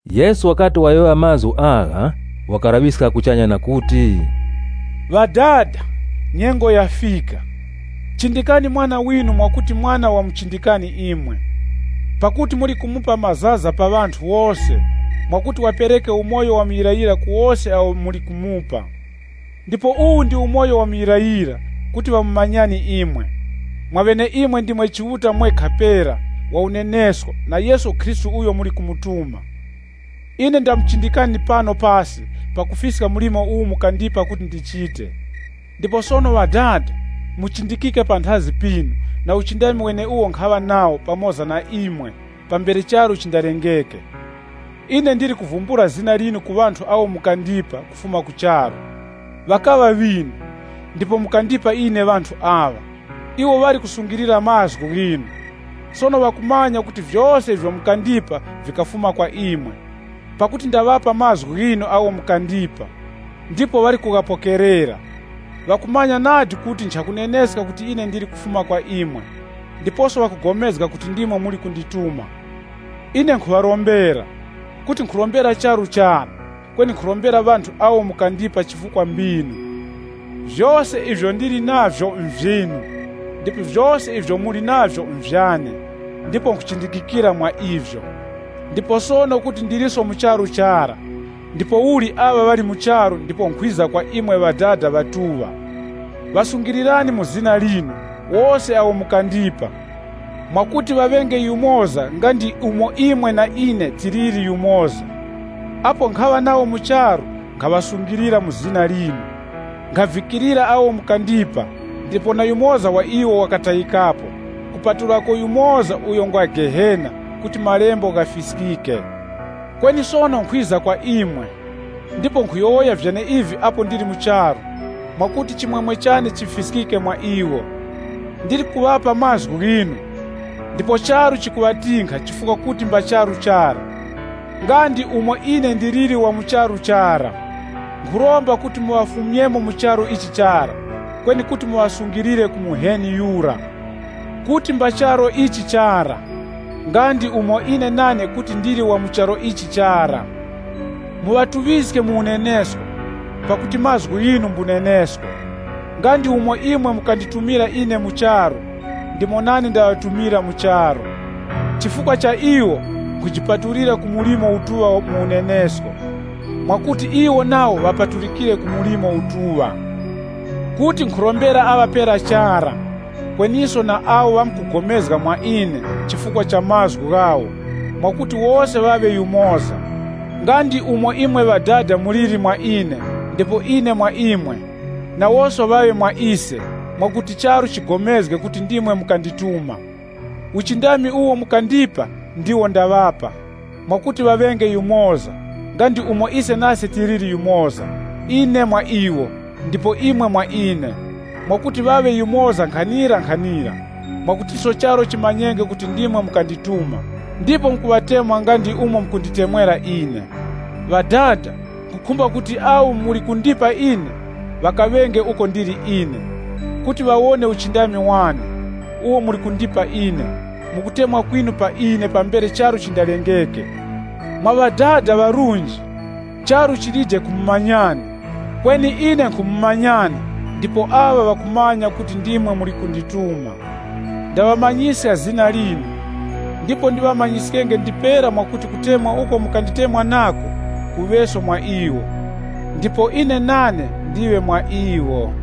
Yesu wakati wayowoya mazgu agha, wakalaŵiska kuchanya na kuti, “Ŵadada, nyengo yafika. Chindikani Mwana winu mwakuti Mwana wamuchindikani Imwe, pakuti muli kumupa mazaza pa ŵanthu wose, mwakuti wapereke umoyo wa muyirayira ku wose awo muli kumupa. Ndipo uwu ndi umoyo wa muyirayira kuti ŵamumanyani imwe, mwaŵeneimwe ndimwe Chiuta mwekha pera wa unenesko na Yesu Khristu uyo muli kumutuma. Ine ndamuchindikani pano pasi pakufiska mlimo uwo mukandipa kuti ndichite. Ndipo sono Ŵadada, mundichindike panthazi pinu na uchindami weneuwo nkhaŵa nawo pamoza na imwe pambere charu chindalengeke. “Ine ndili kuvumbula zina linu ku ŵanthu awo mukandipa kufuma ku charu. Ŵakaŵa ŵinu, ndipo mukandipa ine ŵanthu aŵa. Iwo ŵali kusungilira mazgu ghinu. Sono ŵakumanya kuti vyose ivyo mukandipa vikafuma kwa imwe. Pakuti ndaŵapa mazgu ghinu agho mukandipa, ndipo ŵali kughapokerera. Ŵakumanya nadi kuti nchakuneneska kuti ine ndili kufuma kwa imwe, ndiposo ŵakupulikana kuti ndimwe muli kundituma. “Ine nkhuŵarombera. Kuti nkhurombera charu chara, kweni nkhurombera ŵanthu awo mukandipa chifukwa mbinu. Vyose ivyo ndili navyo nvyinu, ndipo vyose ivyo muli navyo nvyane, ndipo nkhuchindikikira mwa ivyo. Ndipo sono kuti ndiliso mu charu chara ndipouli aŵa ŵali mu charu ndipo nkhwiza kwa imwe Ŵadada Ŵatuŵa, ŵasungilirani mu zina linu wose awo mukandipa, mwakuti ŵaŵenge yumoza nga ndi umo imwe na ine tiliri yumoza. Apo nkhaŵa nawo mu charu, nkhaŵasungilira mu zina linu, nkhavikirira awo mukandipa ndipo na yumoza wa iwo ŵakatayikapo, kupatulako yumoza uyo ngwa Gehena kuti Malembo ghafiskike. Kweni sono nkhwiza kwa imwe, ndipo nkhuyowoya vyeneivi apo ndili mu charu, mwakuti chimwemwe chane chifiskike mwa iwo. Ndili kuŵapa Mazgu ghinu, ndipo charu chikaŵatinkha chifukwa kuti mba charu chara, nga ndi umo ine ndiliri wa mu charu chara. Nkhuromba kuti muŵafumyemo mu charu ichi chara, kweni kuti muŵasungilire ku Muheni Yura. Kuti mba charu ichi chara, nga ndi umo ine nane kuti ndili wa mu charu ichi chara. Muŵatuŵiske mu unenesko, pakuti mazgu ghinu mbunenesko. Nga ndi umo imwe mukanditumira ine mu charu, ndimo nane ndaŵatumira mu charu. Chifukwa cha iwo, nkhujipatulira ku mlimo utuŵa mu unenesko, mwakuti iwo nawo ŵapatulikire ku mlimo utuŵa. “Kuti nkhurombera aŵa pera chara, kweniso na awo ŵamkupulikana mwa ine chifukwa cha mazgu ghawo, mwakuti wose ŵaŵe yumoza. Nga ndi umo imwe Ŵadada muliri mwa ine, ndipo ine mwa imwe, nawoso ŵaŵe mwa ise, mwakuti charu chipulikane kuti ndimwe mukandituma. Uchindami uwo mukandipa ndiwo ndaŵapa, mwakuti ŵaŵenge yumoza, nga ndi umo ise nase tiliri yumoza, ine mwa iwo, ndipo imwe mwa ine, mwakuti ŵaŵe yumoza nkhanirankhanira, mwakutiso charu chimanyenge kuti ndimwe mukandituma, ndipo mukuŵatemwa nga ndi umo mukunditemwera ine. “Ŵadada, nkhukhumba kuti awo muli kundipa ine, ŵakaŵenge uko ndili ine, kuti ŵawone uchindami wane, uwo muli kundipa ine, mu kutemwa kwinu pa ine pambere charu chindalengeke. Mwa Ŵadada ŵarunji, charu chilije kumumanyani, kweni ine nkhumumanyani ndipo aŵa ŵakumanya kuti ndimwe muli kundituma. Ndaŵamanyiska zina linu, ndipo ndiŵamanyiskenge ndipera mwakuti kutemwa uko mukanditemwa nako, kuŵeso mwa iwo, ndipo ine nane ndiŵe mwa iwo.”